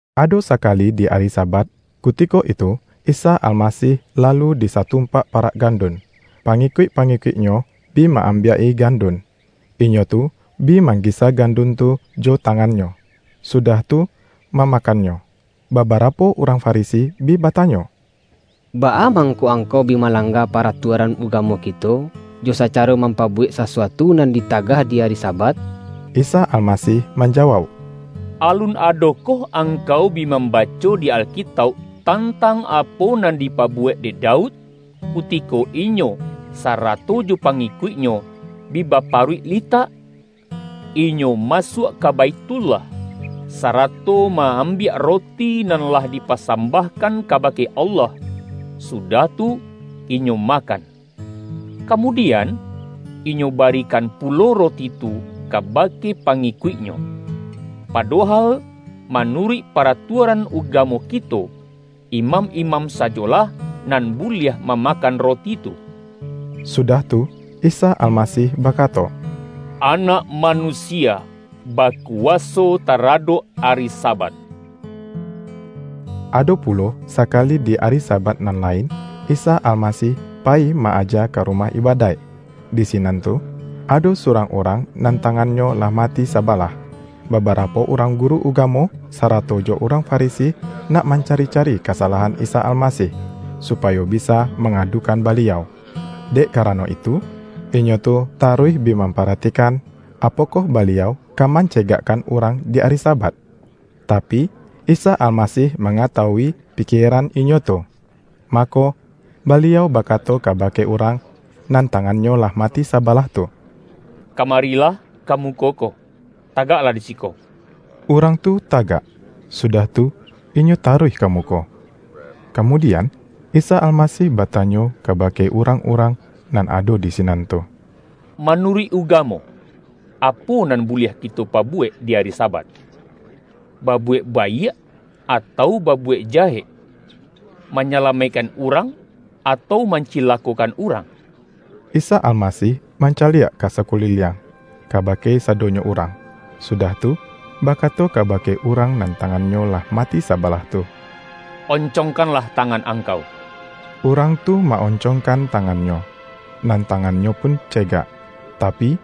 Ado sakali di ari Sabat, kutiko itu Isa Almasih lalu di satumpak parak gandun, pangikuik-pangikuik-Nyo bi ma-ambiak-i gandun. Inyo tu bi manggisa gandun tu jo tangannyo, sudah tu mamakannyo. Babarapo urang Farisi bi batanyo,”Baa mangko angkau bi malangga paratuaran uga-mo kito, jo sacaro mampabuwek sasu-atu nan ditagah di ari Sabat?” Isa Almasih manjawauk,”Alun ado-koh angkau bi mambaco di Alkitauk, tantang apo nan dipabuwek dek Daud, kutiko inyo, sarato jo pangikuiknyo bi baparuik litak? Inyo masuak ka Baithullah, sarato ma-ambiak roti nan lah dipasambahkan kabake Allah, su-dah tu, inyo makan. Kamudian, inyo barikan pulo roti tu kabake pangikuik-nyo. Padohal manuruik paratuaran ugamo kito, imam-imam sajolah nan buliah mamakan roti tu.” Sudah tu, Isa Almasih bakato,”Anak Manusia bakuwaso taradok ari Sabat!” Ado pulo sakali di ari Sabat nan lain, Isa Almasih payi ma-aja ka ru-mah ibadaik. Di sinan tu ado surang urang, nan tangannyo lah mati saba-lah. Babarapo urang guru ugamo, sa-rato jo urang Farisi, nak mancari-ca-ri kasalahan Isa Almasih, supayo bisa mangadukan Baliau. Dek karano itu, inyo tu taruih bi mamparatikan, apo-koh Baliau ka mancegakkan urang di ari Sabat. Tapi, Isa Almasih manga-tawui pikieran inyo tu. Mako, Baliau bakato kabake urang, nan tangannyo lah mati sabalah tu,”Kamarilah, ka muko ko, tagaklah di siko!” Urang tu tagak, sudah tu inyo taruih ka muko. Kamudian, Isa Almasih batanyo ka-bake urang-urang nan ado di sinan tu,”Manuruik ugamo, apo nan buliah kito pabuwek di ari Sabat? Babuwek baiak atau babuwek jahek? Manyala-maikkan urang, atau mancilakokan urang?” Isa Almasih mancaliak ka sakuliliang, kabake sadonyo urang, sudah tu, bakato kabake urang nan tangannyo lah mati sabalah tu,”On-congkanlah tangan angkau.” Urang tu ma-oncongkan tangannyo, nan ta-ngannyo pun cegak. Tapi,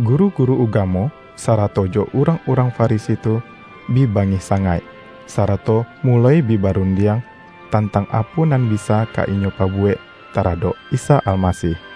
guru-guru ugamo, sarato jo urang-urang Farisi tu, bi bangih sa-ngaik, sarato muloi bi barundiang, tantang apo nan bisa ka inyo pabu-wek taradok Isa Almasih.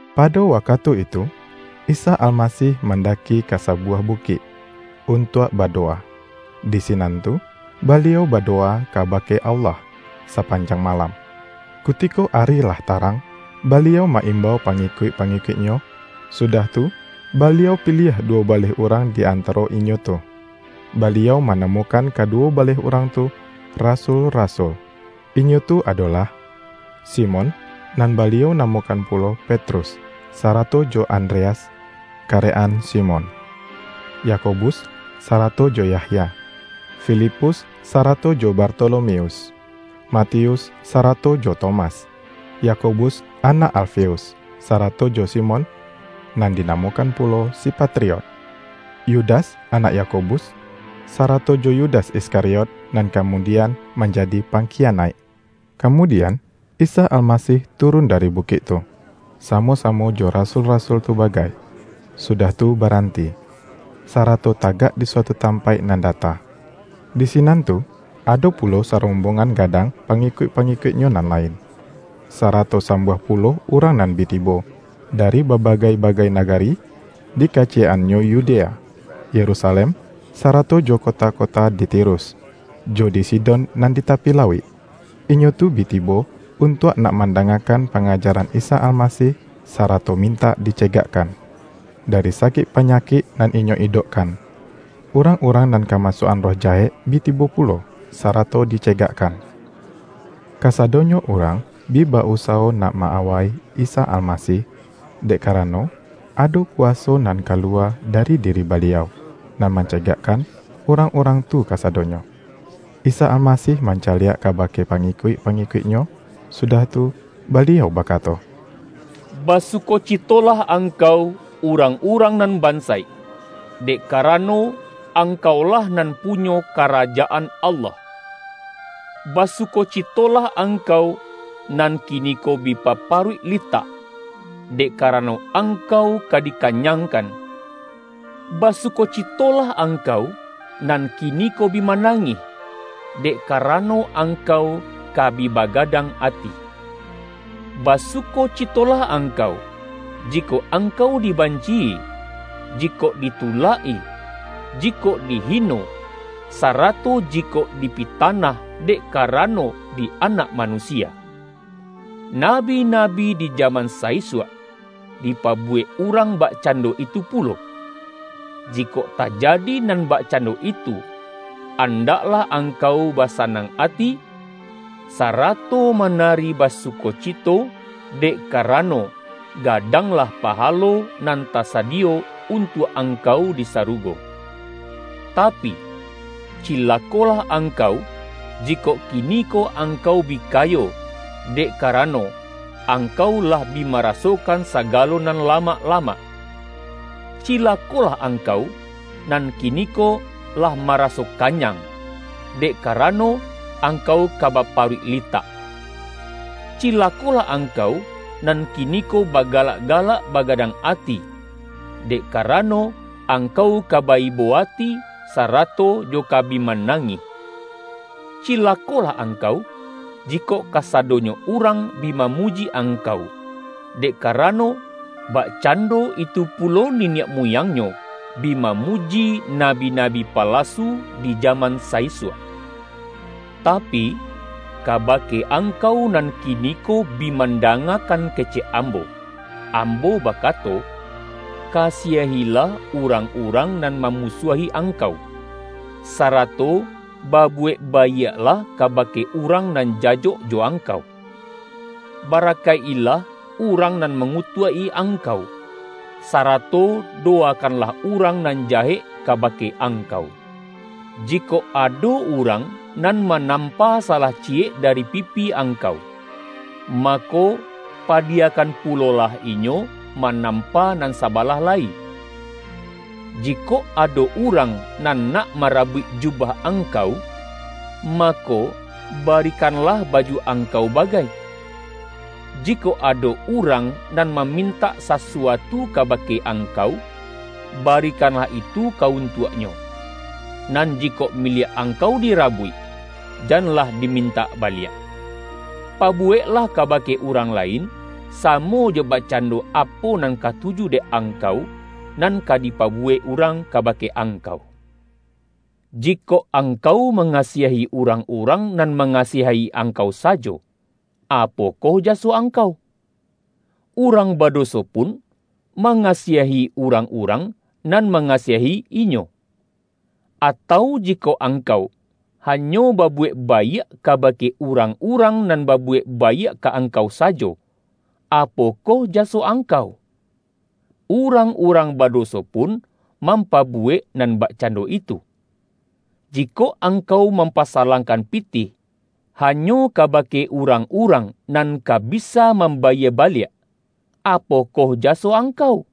Pado wakatu itu, Isa Almasih man-daki ka sabuwah bukik, untuak bado-wa. Di sinan tu, Baliau badowa kaba-ke Allah, sapanjang malam. Kutiko ari lah tarang, Baliau ma-imbau pangi-kuik-pangikuik-Nyo, sudah tu, Baliau piliah duwo baleh urang di antaro inyo tu. Baliau manamokan kaduwo baleh urang tu, rasul-rasul. Inyo tu adolah: Simon (nan Baliau namokan pulo Petrus), sarato jo Andreas, karek-an Simon; Yakobus, sarato jo Yahya, Fi-lipus sarato jo Bartolomeus, Matius sarato jo Tomas, Yakobus anak Alfeus, sarato jo Simon (nan dinamokan pu-lo si Patriot), Yudas anak Yakobus, sarato jo Yudas Iskariot, nan kamudi-an manjadi pangkiyanaik. Kamudian, Isa Almasih turun da-ri bukik tu, samo-samo jo rasul-ra-sul tu bagai, sudah tu baranti, sarato tagak di suatu tampaik nan data. Di sinan tu, ado pulo sarombongan ga-dang pangikuik-pangikuik-Nyo nan lain, sarato sambuah pulo urang nan bi tibo, dari babagai-bagai nagari, di kaciyek-annyo Yudea, Yerusalem, sa-rato jo kota-kota di Tirus, jo di Sidon nan di tapi lauik. Inyo tu bi tibo, untuak nak mandangakan pangaja-ran Isa Almasih, sarato mintak dice-gakkan, dari sakik panyakik nan inyo idokkan. Urang-urang nan kamasuak-an roh jahek, bi tibo pulo, sarato di-cegakkan. Kasadonyo urang bi ba-usawo nak ma-awai Isa Almasih, dek karano, ado kuwaso nan kaluwa dari diri Baliau, nan mancegakkan urang-urang tu kasadonyo. Isa Almasih mancaliak kabake pangikuik-pangikuik-Nyo, sudah tu, Baliau bakato,”Basukocitolah angkau, urang-urang nan bansaik, dek karano angkaulah nan punyo Karajaan Allah! Basukocitolah angkau, nan kiniko bi baparuik litak; dek karano angkau ka dikanyangkan! Basukocitolah angkau, nan kiniko bi manangih; dek karano angkau ka bi bagadang ati! Basukocitolah angkau, jikok ang-kau dibanci-i, jikok ditulak-i, jikok di-hino, sarato jikok dipitanah, dek kara-no di Anak Manusia! Nabi-nabi di jaman sa-isuak, dipabuwek urang bak-cando itu pulo. Jikok tajadi nan bak-cando itu, andaklah angkau basanang ati, sarato manari basukocito, dek ka-rano, gadanglah pahalo nan tasadiyo, untuak angkau di sarugo. Tapi, cilakolah angkau, jikok kiniko angkau bi kayo; dek karano, angkau lah bi marasokan sagalo nan lamak-lamak! Cilakolah angkau, nan kiniko lah maraso kanyang; dek karano, angkau ka baparuik litak! Cilakolah angkau, nan kiniko bagalak-galak bagadang ati; dek karano, angkau ka ba-ibo ati sarato jo ka bi manangih! Cilakolah angkau, jikok kasado-nyo urang bi mamuji angkau; dek ka-rano, bakcando itu pulo niniak mu-yangnyo, bi mamuji nabi-nabi palasu di jaman sa-isuak.” ”Tapi, kabake angkau nan kiniko, bi mandangakan kecek Ambo, Ambo bakato: kasiahilah urang-urang nan mamusuahi angkau, sarato babuwek baiaklah kabake urang nan jajok jo angkau. Barakaik-ilah urang nan mangutuak-i angkau, sarato dowakan-lah urang nan jahek kabake angkau. Jikok ado urang nan manampa sa-lah ciyek dari pipih angkau, mako, pa-diyakan pulolah inyo manampa nan sabalah lai. Jikok ado urang nan nak marabuik jubah angkau, mako, bari-kanlah baju angkau bagai. Jikok ado urang nan mamintak sasuatu kabake angkau, barikanlah itu ka untuaknyo; nan jikok miliak angkau dirabuik, jan-lah dimintak baliak. Pabuweklah kabake urang lain, samo jo bakcando apo nan katuju dek angkau, nan ka di-pabuwek urang kabake angkau. Jikok angkau mangasiahi urang-urang, nan mangasiahi angkau sajo, apokoh jaso angkau? Urang badoso pun mangasiahi urang-urang nan manga-siahi inyo! Atau jikok angkau, hanyo babuwek baiak, kabake urang-urang, nan babuwek baiak ka angkau sajo, apo-koh jaso angkau? Urang-urang badoso pun mampabuwek nan bakcando itu! Jikok angkau mampasalangkan pitih, hanyo kabake urang-urang, nan ka bisa mambayie baliak, apokoh jaso angkau?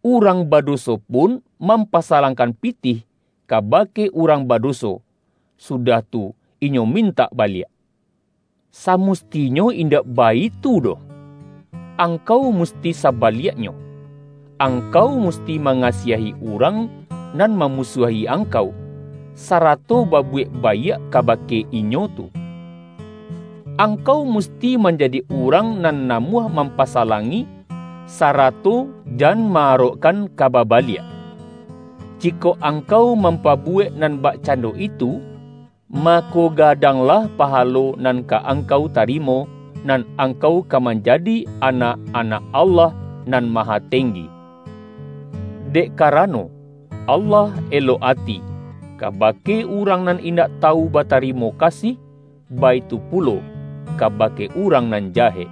Urang badoso pun mampasalangkan pi-tih, kabake urang badoso, sudah tu inyo mintak baliak! Samustinyo indak baitu doh! Angkau musti sabaliaknyo, angkau musti mangasiahi urang nan mamusuahi angkau, sarato babuwek baiak kabake inyo tu. Angkau musti manjadi urang nan namuah mampasa-langi, sarato jan ma-arokkan ka baba-liak. Jikok angkau mampabuwek nan bakcando itu, mako, gadanglah paha-lo nan ka angkau tarimo, nan angkau ka manjadi anak-anak Allah Nan Ma-hatenggi. Dek karano, Allah elok ati, kabake urang nan indak tawu batari-mo kasih, baitu pulo kabake urang nan jahek.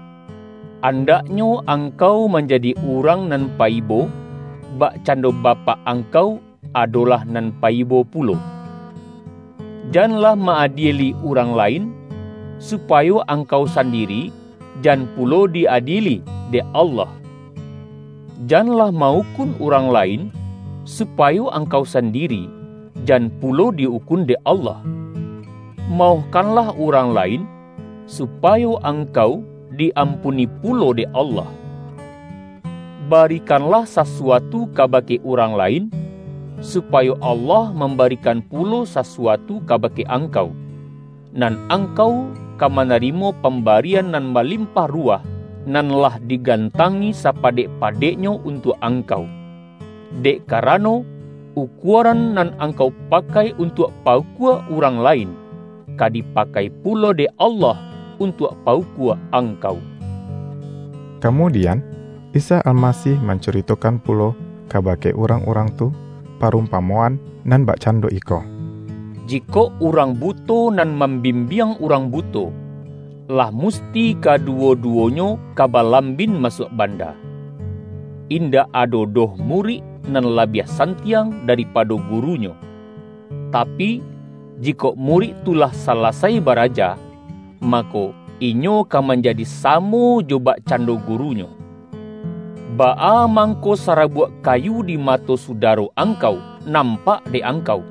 Andaknyo angkau manjadi urang nan paibo, bakcando Bapak ang-kau, adolah nan paibo pulo!” ”Janlah ma-adieli urang lain, supa-yo angkau sandiri jan pulo di-adieli dek Allah. Janlah ma-ukun urang lain, su-payo angkau sandiri, jan pulo di ukun dek Allah. Maohkanlah urang lain, su-payo angkau di-ampuni pulo dek Allah. Barikanlah sasuatu kabake urang la-in, supayo Allah mambarikan pulo sasuatu kabake angkau; nan angkau ka manarimo pambarian nan balimpah ruwah, nan lah digantangi sapadek-padeknyo untuak angkau. Dek karano, ukuaran nan angkau pakai untuak pa-ukua urang lain, ka dipakai pulo dek Allah untuak pa-ukua angkau.” Kamudian, Isa Almasih mancuri-tokan pulo kabake urang-urang tu, pa-rumpamoan nan bakcando iko,”Jikok urang buto nan mambimbiang urang buto, lah musti kaduwo-duwonyo ka balambin masuak banda. Indak ado doh murik nan labiah santiang daripa-do gurunyo. Tapi, jikok murik tu lah salasai baraja, mako, inyo ka manja-di samo jo bakcando gurunyo. Baa mangko sarabuak kayu di mato sudaro angkau, nampak dek angkau,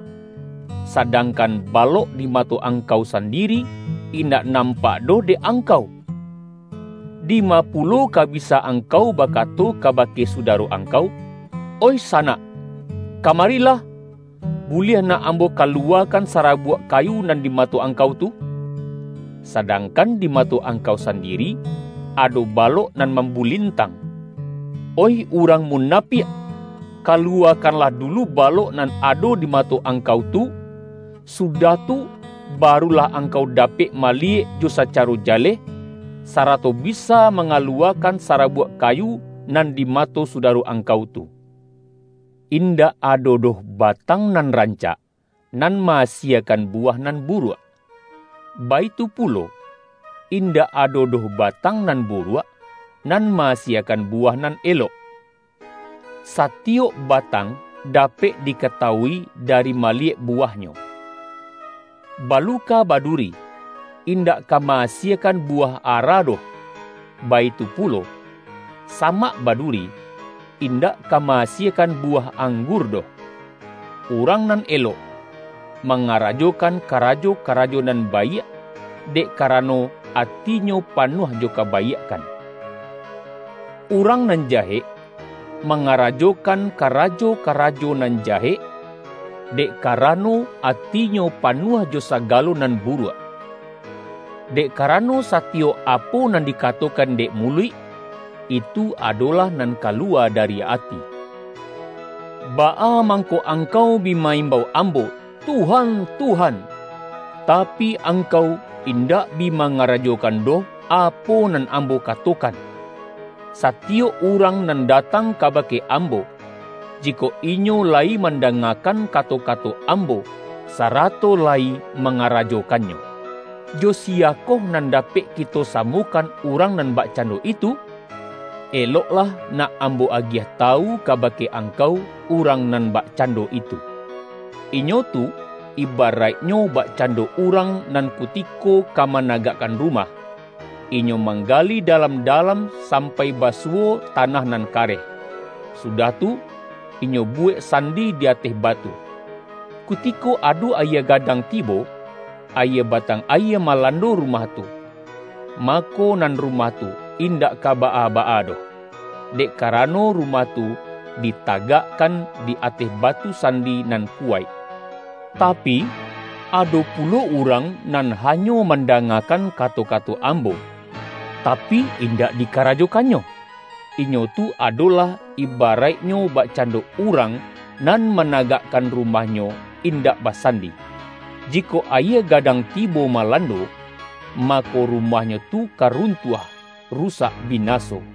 sa-dangkan, balok di mato angkau sandiri, indak nampak doh dek angkau? Dima pulo ka bisa angkau bakato kabake su-daro angkau, ’Oih sanak, kamarilah, buliah nak ambo kaluwakan sarabuak kayu nan di mato angkau tu.’ Sadang-kan di mato angkau sandiri, ado balok nan mambulintang. Oih urang muna-piak! Kaluwakanlah dulu balok nan ado di mato angkau tu. Sudah tu, barulah angkau dapek maliyek jo sacaro jaleh, sarato bisa mangaluwakan sarabuak ka-yu nan di mato sudaro angkau tu.” ”Indak ado doh batang nan rancak, nan ma-asiekan buwah nan buruak. Baitu pulo, indak ado doh batang nan buruak, nan ma-asiekan buwah nan elok. Satiyok batang dapek dikata-wui, dari maliyek buwahnyo. Baluka baduri, indak ka ma-asiekan buwah ara doh, baitu pulo, samak baduri, in-dak ka ma-asiekan buwah anggur doh. Urang nan elok, mangarajokan ka-rajo-karajo nan baiak, dek karano ati-nyo panuah jo kabaiakkan. Urang nan jahek, mangarajokan karajo-karajo nan jahek, dek karano atinyo panuah jo sagalo nan buruak. Dek karano, sa-tiyok apo nan dikatokan dek muluik, itu adolah nan kaluwa dari ati.” ”Baa mangko angkau bi ma-imbau Ambo, ’Tuhan, Tuhan,' tapi, angkau in-dak bi mangarajokan doh, apo nan Am-bo katokan? Satiyok urang nan datang kabake Ambo, jikok inyo layi manda-ngakan kato-kato Ambo, sarato layi ma-ngarajokannyo. Jo siyakoh nan dapek kito samokan urang nan bakcando itu? — Eloklah nak Ambo agiah tawu kaba-ke angkau, urang nan bakcando itu —. Inyo tu, ibaraiknyo bakcando urang nan kutiko ka managakkan rumah, inyo manggali dalam-dalam sampai basuwo tanah nan kareh, sudah tu inyo buwek sandi di ateh batu. Kutiko ado ayie ga-dang tibo, ayie batang ayie malando ru-mah tu, mako, nan rumah tu indak ka baa-baa doh, dek karano rumah tu dita-gakkan di ateh batu sandi nan kuwaik. Tapi, ado pulo urang, nan hanyo man-dangakan kato-kato Ambo, tapi indak dikarajokannyo, inyo tu adolah, ibaraik-nyo bakcando urang nan managakkan rumahnyo indak basandi. Jikok ayie ga-dang tibo malando, mako rumahnyo tu ka runtuah; rusak binaso!”